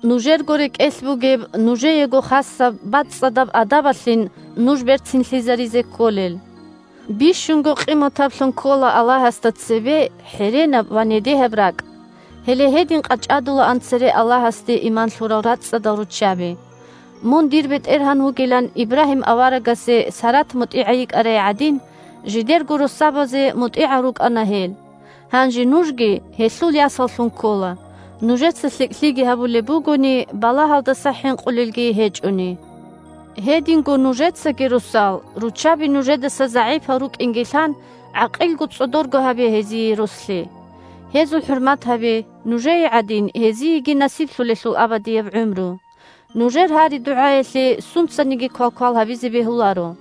Нужерго рекӀелъ бугеб, нужеего хасаб бацӀцӀадаб адабалъин нуж берцинлъизаризе кколел. Бищунго къиматаблъун ккола Аллагьасда цебе хӀеренаб ва недегьаб ракӀ. Гьеле гьедин къачӀадулаан цере Аллагьасде иман лъурал рацӀцӀадал руччаби. Мун дир бетӀергьан вугилан Ибрагьим аварагасе Сарат мутӀигӀай йикӀарай гӀадин, жидерго россабазе мутӀигӀал рукӀана гьел. Гьанже нужги гьелъул ясаллъун ккола, нужеца лъикӀлъиги гьабулеб бугони, балагьалдаса хӀинкъулелги гьечӀони. Гьединго нужецаги, росал, руччаби нужедаса загӀипал рукӀинги лъан, гӀакъилго-цӀодорго гьабе гьезие рослъи. Гьезул хӀурмат гьабе, нужее гӀадин, гьезиеги насиблъулелъул абадияб гӀумру. Нужер гьари-дугӀаялъе сунцаниги квалквал гьабизе бегьуларо.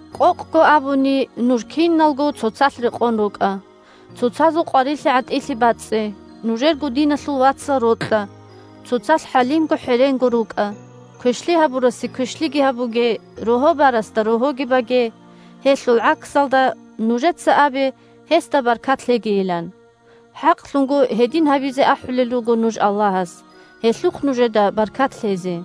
Къокъго абуни, нуж киналго цоцалъ рекъон рукӀа, цоцазул къварилъи-гӀатӀилъи бацӀцӀе, нужерго диналъул вацал рокьа, цоцалъ хӀалимго-хӀеренго рукӀа. Квешлъи гьабурасе квешлъиги гьабуге, рогьо барасда рогьоги баге, гьелъул гӀаксалда, нужеца абе гьесда баркат лъегийилан. ХӀакълъунго гьедин гьабизе ахӀулел руго нуж Аллагьас, гьелъухъ нужеда баркат лъезе.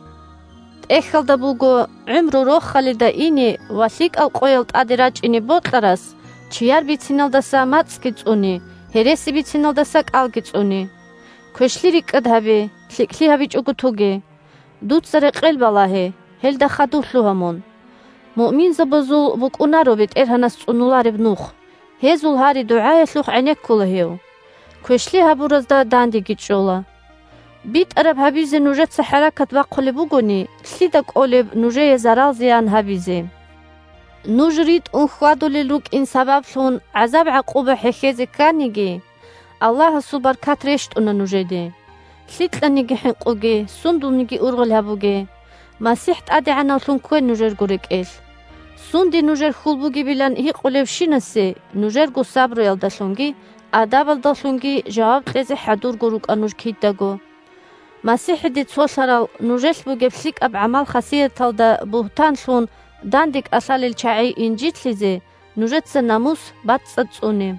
ТӀехьалда буго: «ГӀумру рохалида ине ва лъикӀал къоял тӀаде рачӀине бокьарас чияр бициналдаса мацӀги цӀуне, гьереси бициналдаса кӀалги цӀуне». Квешлъи рикӀкӀад гьабе, лъикӀлъи гьабичӀого тоге. Дуца рекъел балагье, гьелда хадув лъугьа мун. Муъминзабазул букӀунаро БетӀергьанас цӀунулареб нух, гьезул гьари-дугӀаялъухъ гӀенеккула Гьев, квешлъи гьабуразда дандеги чӀола. БитӀараб гьабизе нужеца хӀаракат бахъулеб бугони, лъида кӀолеб нужее зарал-зиян гьабизе? Нуж ритӀун хьвадулел рукӀин сабаблъун гӀазаб-гӀакъуба хӀехьезе кканиги, Аллагьасул баркат рещтӀуна нужеде. Лъикьаниги хӀинкъуге, сундулниги ургъел гьабуге. МасихӀ ТӀадегӀанавлъун ккве нужерго рекӀелъ. Сунде нужер хьул бугебилан гьикъулевщинасе нужерго сабруялдалъунги адабалдалъунги жаваб кьезе хӀадурго рукӀа нуж кидаго. МасихӀиде цолъарал нужелъ бугеб лъикӀаб гӀамал-хасияталда бугьтан лъун данде кӀалъалел чагӀи инжитлъизе, нужеца намус бацӀцӀад цӀуне.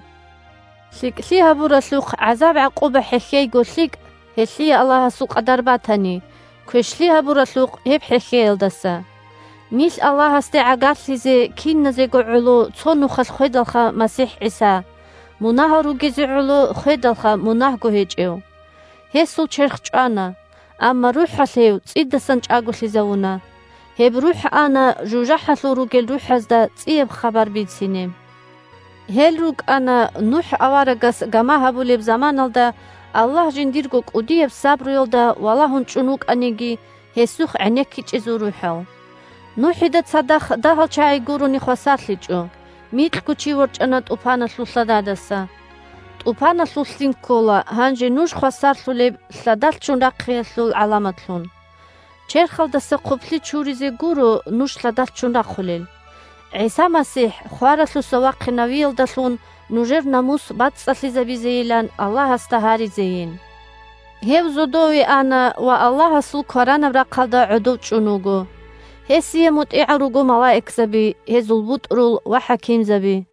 ЛъикӀлъи гьабуралъухъ гӀазаб-гӀакъуба хӀехьейго лъикӀ (гьелъие Аллагьасул къадар батани), – квешлъи гьабуралъухъ гьеб хӀехьеялдаса. Нилъ Аллагьасде гӀагарлъизе киназего гӀоло цо нухалъ хведалха МасихӀ ГӀиса, – мунагьал ругезе гӀоло хведалха мунагьго гьечӀев. Гьесул черх чӀвана, амма РухӀалъ гьев цӀидасан чӀаголъизавуна. Гьеб РухӀ ана жужахӀалъур ругел рухӀазда цӀияб хабар бицине. Гьел рукӀана, НухӀ аварагас гама гьабулеб заманалда, Аллагь жиндирго кӀудияб сабруялда валагьун чӀун вукӀаниги, Гьесухъ гӀенеккичӀезул рухӀал. НухӀида цадахъ дагьал чагӀи гурони хвасарлъичӀо, микьго чи ворчӀана тӀупаналъул лъададаса. ТӀупаналъул лъим ккола гьанже нуж хвасарлъулеб лъадалъ ччун рахъиялъул гӀаламатлъун. Черхалдаса хъублъи чуризе гуро нуж лъадалъ ччун рахъулел, – ГӀиса МасихӀ хваралъуса вахъинавиялдалъун нужер намус бацӀцӀалъизабейилан Аллагьасда гьаризейин. Гьев зодове ана ва Аллагьасул кваранаб рахъалда гӀодов чӀун вуго. Гьесие мутӀигӀал руго малаикзаби, гьезул бутӀрул ва хӀакимзаби.